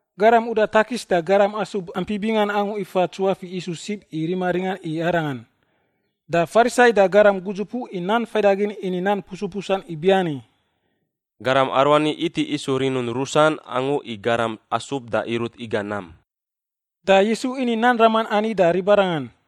Garam uda takis da garam asub ampi bingan angu ifa tsuafiꞌ Yisu sib i rima ringan i Arangan. Da Farisai da garam gudzupuꞌ i nan faidagin ini nan pusupusan ibiani, “Garam aruani iti isu rinun rusan angu i garam asub da irut iga nam.” Da Yisu ini nan raman ani da ribarangan: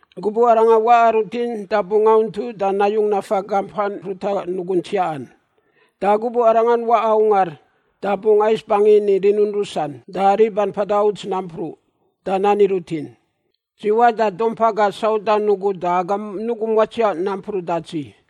Gubuꞌ arangan waꞌa rutin da bungꞌ auntu da nayung nafa gampan ruta nugun tsiaꞌan. Da gubuꞌ arangan waꞌa ungar da bungꞌ ais bangin i rinun rusan da riban mpada uts nampruꞌ da nani rutin, ‘Dzi waꞌ da dumpa gaꞌ saudan ugu da agam nugum watsiaꞌ nampruꞌ da dzi.’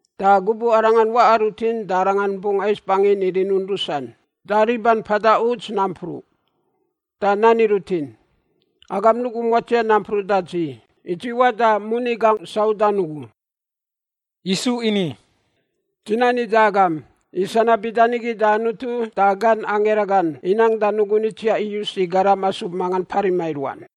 Da gubuꞌ arangan waꞌa rutin da arangan bungꞌ ais bangin i rinun rusan da riban mpada uts nampruꞌ. Da nani rutin, ‘Agam nugum watsiaꞌ nampruꞌ da dzi, i dzi waꞌ da moni gangꞌ saudan ugu.’” Yisu ini, “Dzi nani da agam, i sanab bida nigi da Anutu da gan angira gan inang da nugun itsiaꞌ iyus i garam asub mangan parima i ruan.”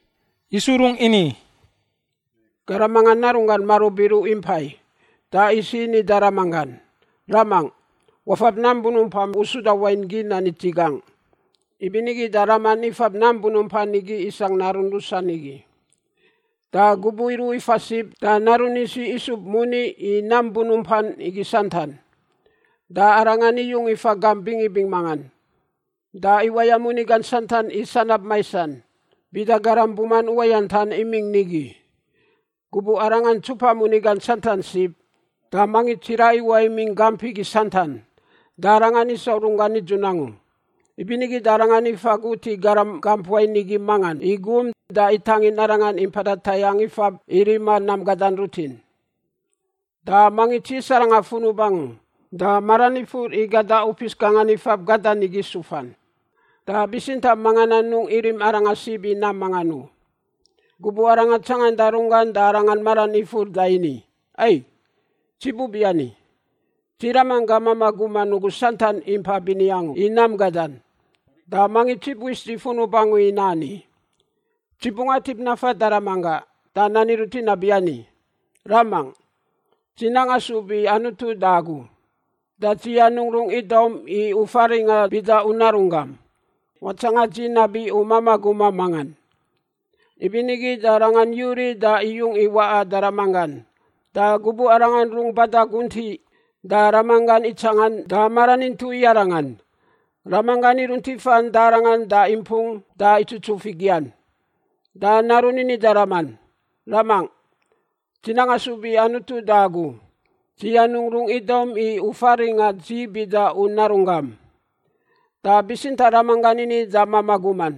Yisu rung ini, “Garam mangan narunggan marub iruꞌ impai. Da isiꞌ ini da ramanggan, ‘Ramangꞌ, wafab nam bunumpam u suda wain gin ani dzi gangꞌ.’ Ibinigi da raman ifab nam bunumpan igi isangꞌ narun rusan igi. “Da gubuꞌ iruꞌ ifa sib da narun isiꞌ isub moni i nam bunumpan igi santan. Da arangan iyung ifa gamp bingibing mangan. Da iwaya moni gan santan i sanab maisan bida garam buman uwayantan imingꞌ nigi. Gubuꞌ arangan ntsupa moni gan santan sib da mangits tsiraꞌ iwaꞌ imingꞌ gamp igi santan. Da arangan isau runggan nidzun angu. Ibinigi da arangan ifa gut i garam gamp wain igi mangan i gum da itangin arangan i mpada tayangꞌ ifab i rima nam gada rutin. Da mangits yis arangan funub angu da maran ifur i gada upis gangan ifab gadan igi sufan, da bitsintaꞌ mangan anungꞌ irim arangan sib i nam mangan u. “Gubuꞌ arangan tsanganda runggan da arangan maran ifur da ini, ‘Ai, dzi bubiani! Dzi ramanggaꞌ mamaꞌ guman ugu santan impa bini angu i nam gadan, da mangits ibu is dzi funub angu i nani! Dzi bungꞌ atip nafan da ramanggaꞌ da nani rutin nabiani, “Ramangꞌ, dzi nang asub i Anutu da agu, da dzi anungꞌ rung idaum i u faringꞌa bida u narunggam. Watsanga dzi nabi u mamaꞌ gumam mangan.”’ “Ibinigi da arangan yuriꞌ da iyung i waꞌa da ramanggan. Da gubuꞌ arangan rung bada guntiꞌ da ramanggan itsangan da maran intuꞌ i arangan. Ramanggan irunt ifan da arangan da impung da itsutsuf i gian. Da narun ini da raman, ‘Ramangꞌ, dzi nang asub i Anutu da agu. Dzi anungꞌ rung idaum i u faringꞌa dzi bida u narunggam.’ “Da bitsintaꞌ ramanggan ini da mamaꞌ guman,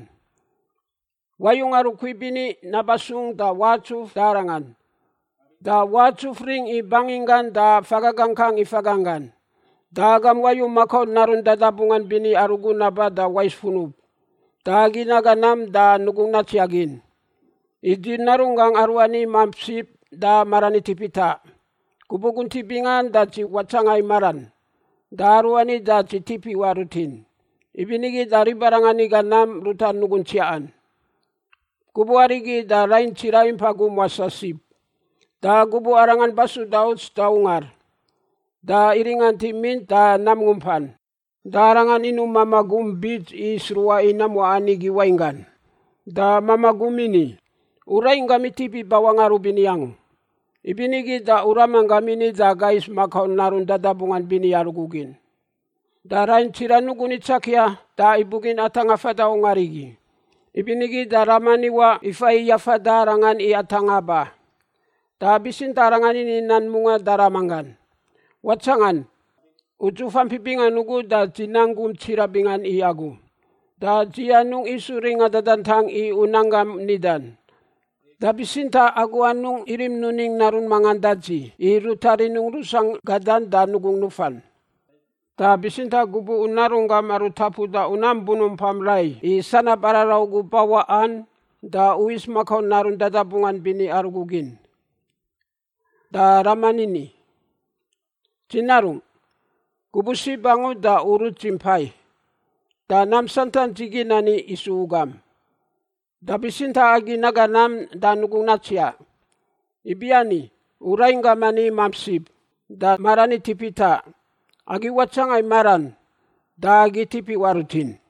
‘Wayu ngarukui bini naba sung da watsuf da arangan, da watsuf ring i banginggan da faga gangkang i faganggan. Da agam wayu makau narun dadabungan bini arugu naba da wais funub. Da agi naga nam da nugungꞌ natsiaꞌ gin. I dzi narunggaꞌ aruani imamp sib da maran itip itaꞌ. Gubuꞌ guntiꞌ bingan da dzi watsanga i maran da aruani da dzi tip iwaꞌ rutin.’ Ibinigi da ribarangan iga nam ruta nugun tsiaꞌan. “Gubuꞌ arigi da rain tsiraꞌ impa gum wasaꞌ sib. Da gubuꞌ arangan basuda uts da ungar, da iringant i mint da nam ngumpan. Da arangan inuꞌ mamaꞌ gum bits i sruꞌa i nam waꞌan igi wainggan. Da mamaꞌ gum ini, ‘U rainggam itip ibawaꞌ ngarubini angu, ibinigi da u ramanggam ini da aga is makau narun dadabungan bini arugu gin.’ “Da rain tsiraꞌ nugun itsakia da ibugin atangꞌa fada ungar igi. Ibinigi da raman iwaꞌ ifa i yafada arangan i atangꞌa ba. Da bitsintaꞌ arangan ini nan mungaꞌ da ramanggan, ‘Watsangan! Udzuf ampi bingan ugu da dzi nang gum tsiraꞌ bingan i agu. Da dzi anungꞌ isu ringa dadantang i u nan gam nidan. Da bitsintaꞌ agu anungꞌ irim nuning narun mangan da dzi i ruta rinungꞌ rusangꞌ gadan da nugungꞌ nufan! Da bitsintaꞌ gubuꞌ u narunggam aru tapuda u nam bunumpam rai i sanab araraꞌ ugu bawaꞌan da u is makau narun dadabungan bini arugu gin!’ “Da raman ini, ‘Dzi narungꞌ, gubuꞌ sib angu da u rut dzi mpai, da nam santan dzi gin ani isu u gam. Da bitsintaꞌ agi naga nam da nugungꞌ natsiaꞌ, ibiani u rainggam ani imamp sib da maran itip itaꞌ; agi watsanga i maran da agi tip iwaꞌ rutin.’”